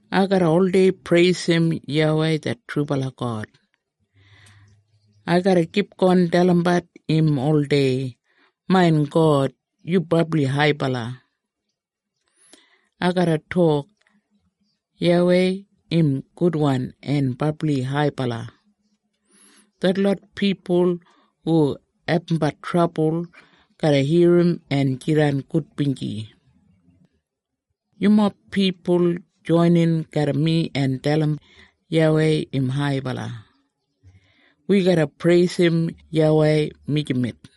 Ai garra oldei preisim YAWEI det trubala God. Ai garra kipgon dalimbat im oldei, “Main God, yu brabli haibala!” Ai garra tok, “YAWEI, im gudwan en brabli haibala!” Detlot pipul hu abumbat trabul garra irrim en jidan gudbinji. Yumob pipul joinin garram mi en dalim YAWEI im haibala. Wi garra preisim YAWEI mijamet.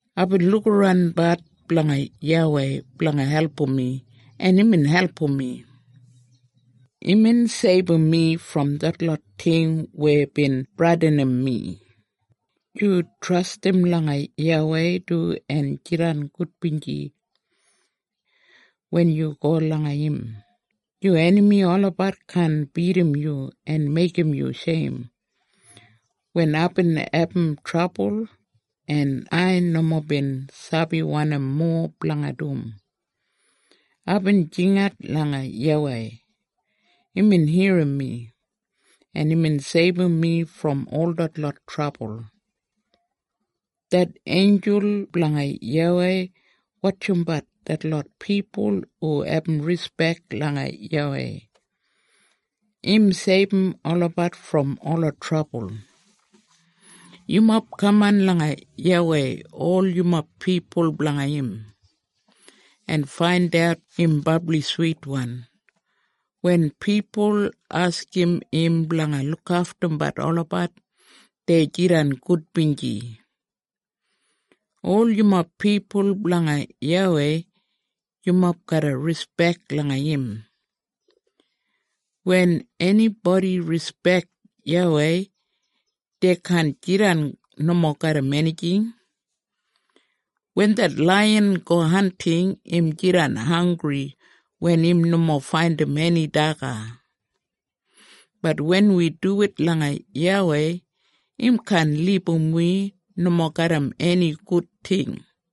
Aibin lukaranbat blanga YAWEI blanga album mi, en imbin album mi. Imbin seibum mi brom detlot ting weya bin bradinim mi. Yu trastim langa YAWEI du en jidan gudbinji. Wen yu go langa im, yu enami olabat kaan bidim yu en meigim yu sheim. Wen aibin abum trabul, en ai nomo bin sabi wanim mowa blanga dum, aibin jingat langa YAWEI. Imbin irrim mi, en imbin seibum mi brom ol detlot trabul. Det einjul blanga YAWEI wotjimbat detlot pipul hu abum rispek langa YAWEI. Im seibum olabat brom ola trabul. Yumob kaman langa YAWEI ol yumob pipul blanga im, en faindat im brabli switwan. Wen pipul askim im blanga lukaftum olabat, dei jidan gudbinji. Ol yumob pipul blanga YAWEI, yumob garra rispek langa im. Wen enibodi rispek YAWEI, dei kaan jidan nomo garram enijing. Wen det laiyan go hanting, im jidan hanggri wen im nomo faindim eni daga, bat wen wi duwit langa YAWEI, im kaan libum wi nomo garram eni gud ting.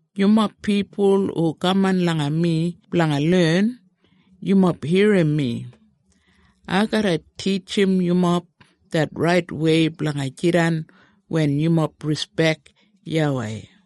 Yumob pipul hu kaman langa mi blanga len, yumob irrim mi. Ai garra titjim yumob det raitwei blanga jidan wen yumob rispek YAWEI.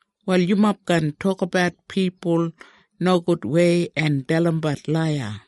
wal yumob kaan tokabat pipul nogudwei en dalimbat laiya!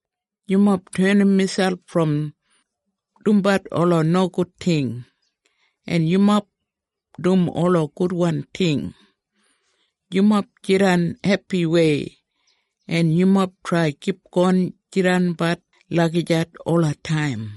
Yumob tenim miselp brom dumbat ola nogud ting, en yumob dum ola gudwan ting. Yumob jidan hepiwei, en yumob trai kipgon jidanbat lagijat olataim.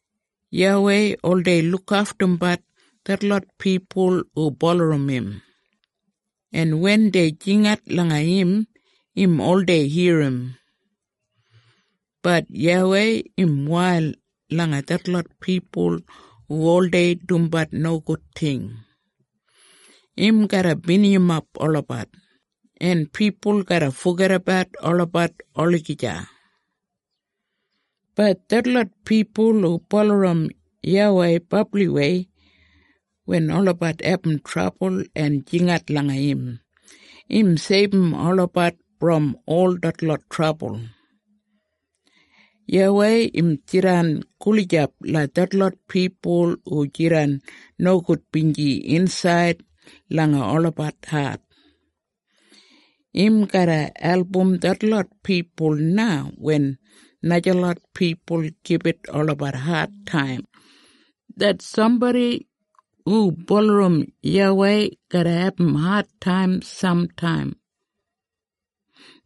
YAWEI oldei lukaftumbat detlot pipul hu bulurrum im. En wen dei jingat langa im, im oldei irrim. Bat YAWEI im wail langa detlot pipul hu oldei dumbat nogud ting. Im garra binijimap olabat, en pipul garra fogedabat olabat olagija. Bat detlot pipul hu bulurrum YAWEI brabliwei, wen olabat abum trabul en jingat langa im, im seibum olabat brom ol detlot trabul. YAWEI im jidan gulijap langa detlot pipul hu jidan nogudbinji insaid langa olabat hat. Im garra album detlot pipul na wen najalot pipul gibit olabat adtaim. Det sambodi hu bulurrum YAWEI garra abum adtaim samtaim.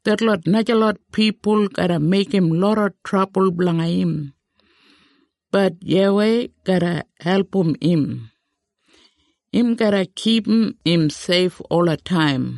Detlot najalot pipul garra meigim loda trabul blanga im, bat YAWEI garra album im. Im garra kipum im seif olataim.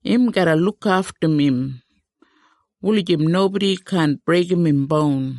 Im garra lukaftum im, wulijim nobodi kaan breigim im boun.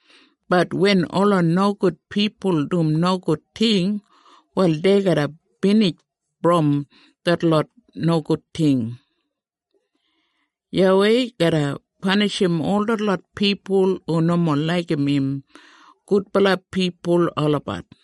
Bat wen ola nogud pipul dum nogud ting, wal dei garra binij brom detlot nogud ting. YAWEI garra panishim ol detlot pipul hu nomo laigim im gudbala pipul olabat.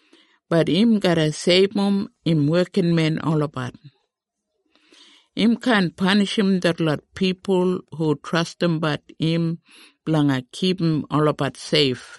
Bat im garra seibum im wekinmen olabat. Im kaan panishim detlot pipul hu trastimbat im blanga kipum olabat seif.